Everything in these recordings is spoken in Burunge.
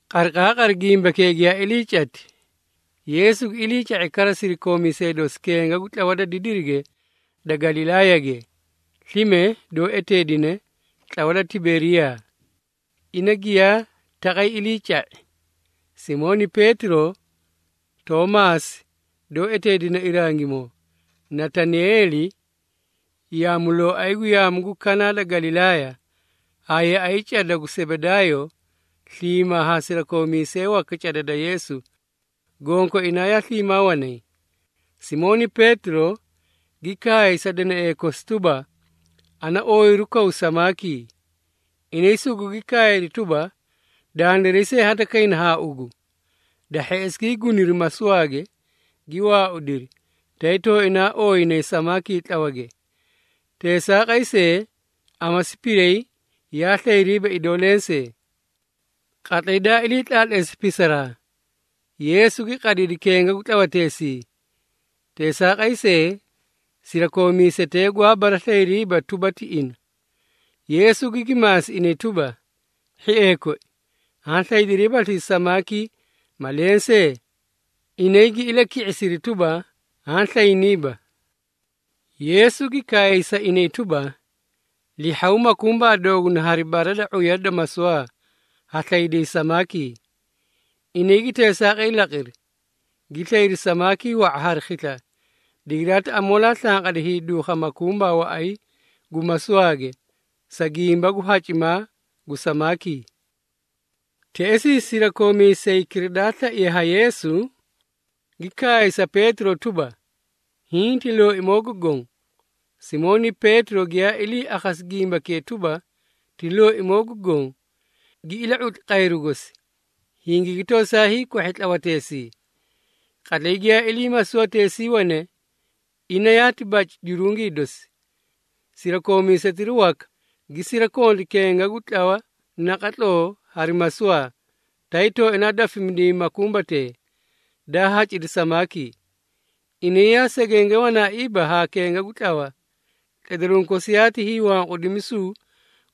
Qariqaaqari gimbakee giyaa ilii cati, Yeesu gi iliica⁄i kara sirakoomiisee dosi kenga gu tlawa da didiri da Galilaayage, slime doó eteedine “Tlawa da Tiberiyaa.” Ina giyaa taqay iliica⁄i, Simooni Peetiro, Toomaasi doó eteedine Irangimoo, Natanaeeli yaamulooay gu yaamu gu Kanaa da Galilaaya, haa yaꞌay cada gu Sebedaayo sliimaa haa sirakoomiisee waka cada da Yeesu, gonkoinaa yaa sliimaa wanay. Simooni Peetiro, gi kaay sa danaee kosi tuba, “Ana ooyiru kaw samaakii.” Inay sugugi kaayri tuba, “Dandiray see hadakayna haa ugu.” Da hheꞌesi gii guniri masuwaage, gi waaudiri, tay tooinaa ooyinay samaakii tlawage. Teesaaqay see, amasi piray yaa slayriiba idoo lensee. Qatlay daa ilii tlaatleesi pisaraa, Yeesu gi qadidi kenga gu tlawateesii. Teesaaqay see, sirakoomiisetee gwaa baraslayiriiba tuba, ti ina. Yeesu gigi maasi inay tuba, “Hhiee koi, haã slaydiriibaslii samaakii ma lensee?” Inay gi ilaki⁄isiri tuba, “Haã slayniiba.” Yeesu gi kaay sa inay tuba, “Lihhaw makumbaa dooguna hari bara da ⁄uya da masuwaa, ha slayday samaakii.” Inay gi teesaaqay laqiri, gi slayri samaakii wa⁄a hari khisla, digiraati amoolaa slanqadi hiiduukha makumbaa waꞌay gu masuwaage, sa gimba gu hacimaa gu samaakii. Teꞌesii sirakoomiisaykira daa slaiye ha Yeesu, gi kaay sa Peetiro tuba, “Hiĩ ti Looimoo gu Goõ!” Simooni Peetiro giyaa ilii akhasi gimbakee tuba, ti Looimoo gu Goõ, gi ila⁄utli qayru gosi, hingigi tosaa hiikwahhi tlawateesii. (Qatlay giyaa ilii masuwateesii wane, ina yaati baci jurungii dosi.) Sirakoomiisetira waka gi sirakonti kenga gu tlawa naqatloo hari masuwaa, tay tooinaa dafimidiyay makumbatee, daa hacidi samaakii. Inay yaa segenge wanaaiiba haa kenga gu tlawa, tledaruũ kosi yaati hiiwanqudimisu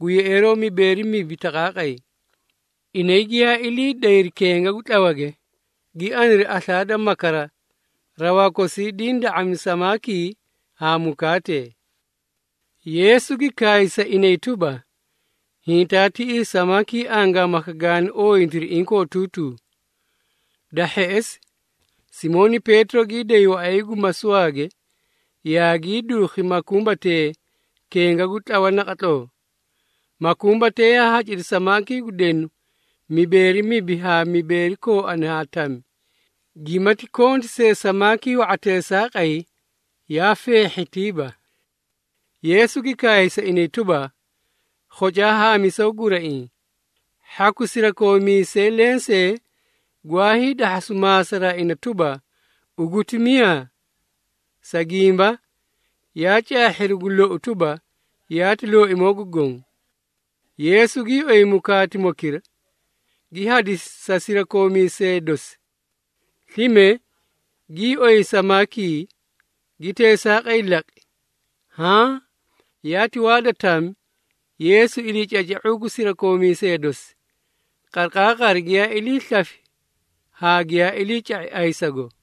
gu yeꞌeeroo mibeeri mibi taqaaqay. Inay giyaa ilii dayri kenga gu tlawage, gi aniri aslaa da makara, rawaa kosii diĩ da⁄ami samaakii haa mukaatee. Yeesu gi kaay sa inay tuba, “Hintaa tiꞌii samaakii angaamaka gaani ooyintiri inkootuutuu.” Da hheꞌesi, Simooni Peetiro gii day waꞌay gu masuwaage, yaagii duukhi makumbatee kenga gu tlawa naqatloo. Makumbatee yaa hacidi samaakii gu denu mibeeri mibi haa mibeeri kooani haa tami, gimati konti see samaakii wa⁄a teesaaqay, yaa feehhitiiba. Yeesu gi kaay sa inay tuba, “Khocaa haamisaw guraiĩ.” Hhaku sirakoomiisee lensee gwaa hiidahhasu maasaraa ina tuba, “Ugu ti miyaa?” Sa gimba, yaa caahhiri gu lou tuba, yaati Looimoo gu Goõ. Yeesu gii oyi mukaatimokira, gi hadisi sa sirakoomiisee dosi. Slime, gii oyi samaakii, gi teesaaqay laqi. Haã yaati waa da tami, Yeesu iliicaca⁄uu gu sirakoomiisee dosi, qariqaaqari giyaa ilii slafi haa giyaa iliica⁄i ayisago.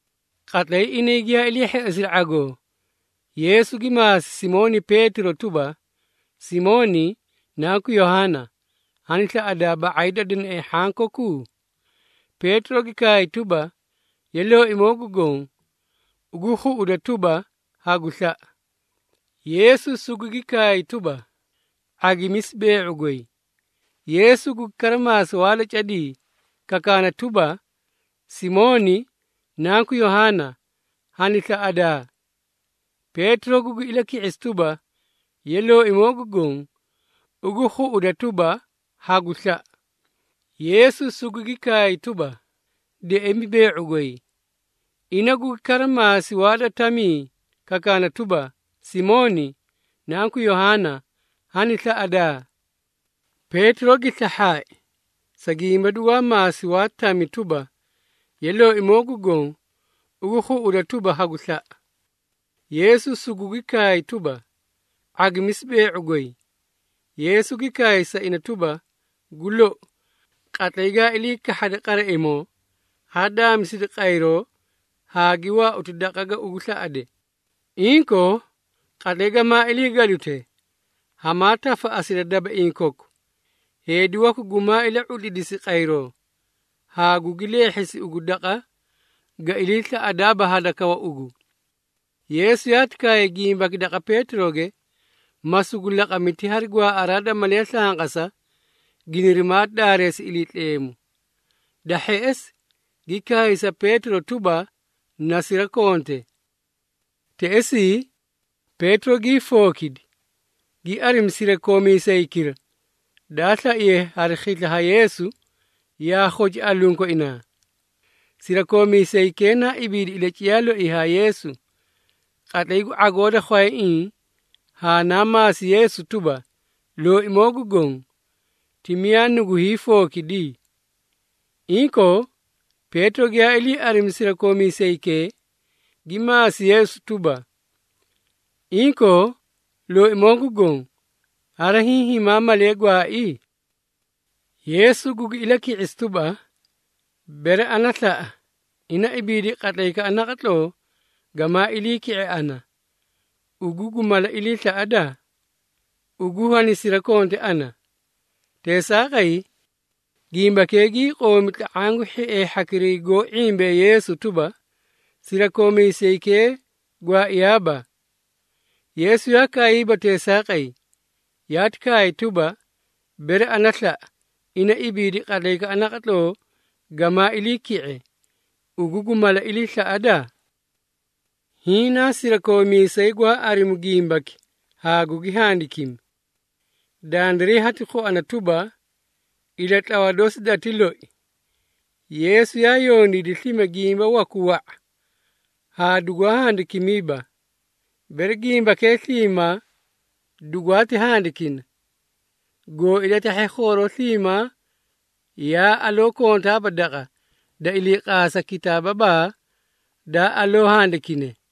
Qatlay inay giyaa ilii hheꞌesiri ⁄agoo, Yeesu gi maasi Simooni Peetiro tuba, “Simooni, nanku Yohaana, hani slaꞌadaa, ba⁄ay da danaee hhanki koku?” Peetiro gi kaay tuba, “Ye, Looimoo gu Goõ, ugu khuꞌuda tuba, hagu slaꞌa.” Yeesu sugugi kaay tuba, “⁄agimisi bee⁄u goy.” Yeesu gugi kara maasi waa da cadii, kakaana tuba, “Simooni, nanku Yohaana, hani slaꞌadaa?” Peetiro gugi ilaki⁄isi tuba, “Ye, Looimoo gu Goõ, ugu khuꞌuda tuba, hagu slaꞌa.” Yeesu sugugi kaay tuba, “Deꞌemi bee⁄u goy.” Ina gugi kara maasi waa da tamii, kakaana tuba, “Simooni, nanku Yohaana, hani slaꞌadaa?” Peetiro gi slahhaai, sa gimba dugwaa maasi waa tami tuba, “Ye, Looimoo gu Goõ, ugu khuꞌuda tuba, hagu slaꞌa.” Yeesu sugugi kaay tuba, “⁄agimisi bee⁄u goy.” Yeesu gi kaay sa ina tuba, “Gu lou, qatlay gaa ili kahhade qaraimoo, haa daamisidi qayroo haa gi waauti daqa ga ugu slaꞌade. Inkoo, qatlay gamaa ilii gadute, hamaa tafaꞌasida dabaiĩ koku, heedi waku gumaa ila⁄utlidisi qayroo, haa gugi leehhisi ugu daqa ga ilii slaꞌadaaba hadakawa ugu.” Yeesu yaati kaay gimbaki daqa Peetiroge, ma sugu laqami ti hari gwaaꞌaraa da malee slanqasa, ginirimaa daareesi Iliitleemu. Da hheꞌesi, gi kaay sa Peetiro tuba, “Na sirakonte!” Teꞌesii, Peetiro gii fookidi, gi arimi sirakoomiisaykira, daa slaiye hari khisla ha Yeesu, yaa khoci alunkoinaa. Sirakoomiisaykee naa ibiidi ilaciyaa loii haa Yeesu, qatlay gu ⁄agoo da khwayaiĩ, haa naa maasi Yeesu tuba, “Looimoo gu Goõ, ti miyaa nugu hiifookidi?” Inkoo, Peetiro giyaa ilii arimi sirakoomiisaykee, gi maasi Yeesu tuba, “Inkoo, Looimoo gu Goõ, hari hiĩ himaa malee gwaai?” Yeesu gugi ilaki⁄isi tuba, “Bere ana slaꞌa, ina ibiidi qatlaykaꞌa naqatloo gamaa ilii ki⁄e ana, ugu gu mala ilii slaꞌada? Ugu, hanisirakonte ana!” Teesaaqay, gimbakee gii qoomi tla⁄aã gu hhiee hhakira goó ⁄imbee Yeesu tuba, sirakoomiisaykee gwaaiyaaba. Yeesu yaa kaayiiba teesaaqay, yaati kaay tuba, “Bere ana slaꞌa, ina ibiidi qatlaykaꞌa naqatloo gamaa ilii ki⁄e, ugu gu mala ilii slaꞌada?” Hiĩ naa sirakoomiisay gwaa arimu gimbaki haa gugi handikimi. Dandiray hati khuana tuba, ilatlawa dosi dati loi. Yeesu yaa yondiidi slime gimba waku wa⁄a haa dugwaa handikimiiba. Bere gimbakee sliimaa dugwaati handikina, goó ilatahhe khooroo sliimaa yaa aloo kontaaba daqa, da iliiqaasa kitaababaa daa aloo handikine.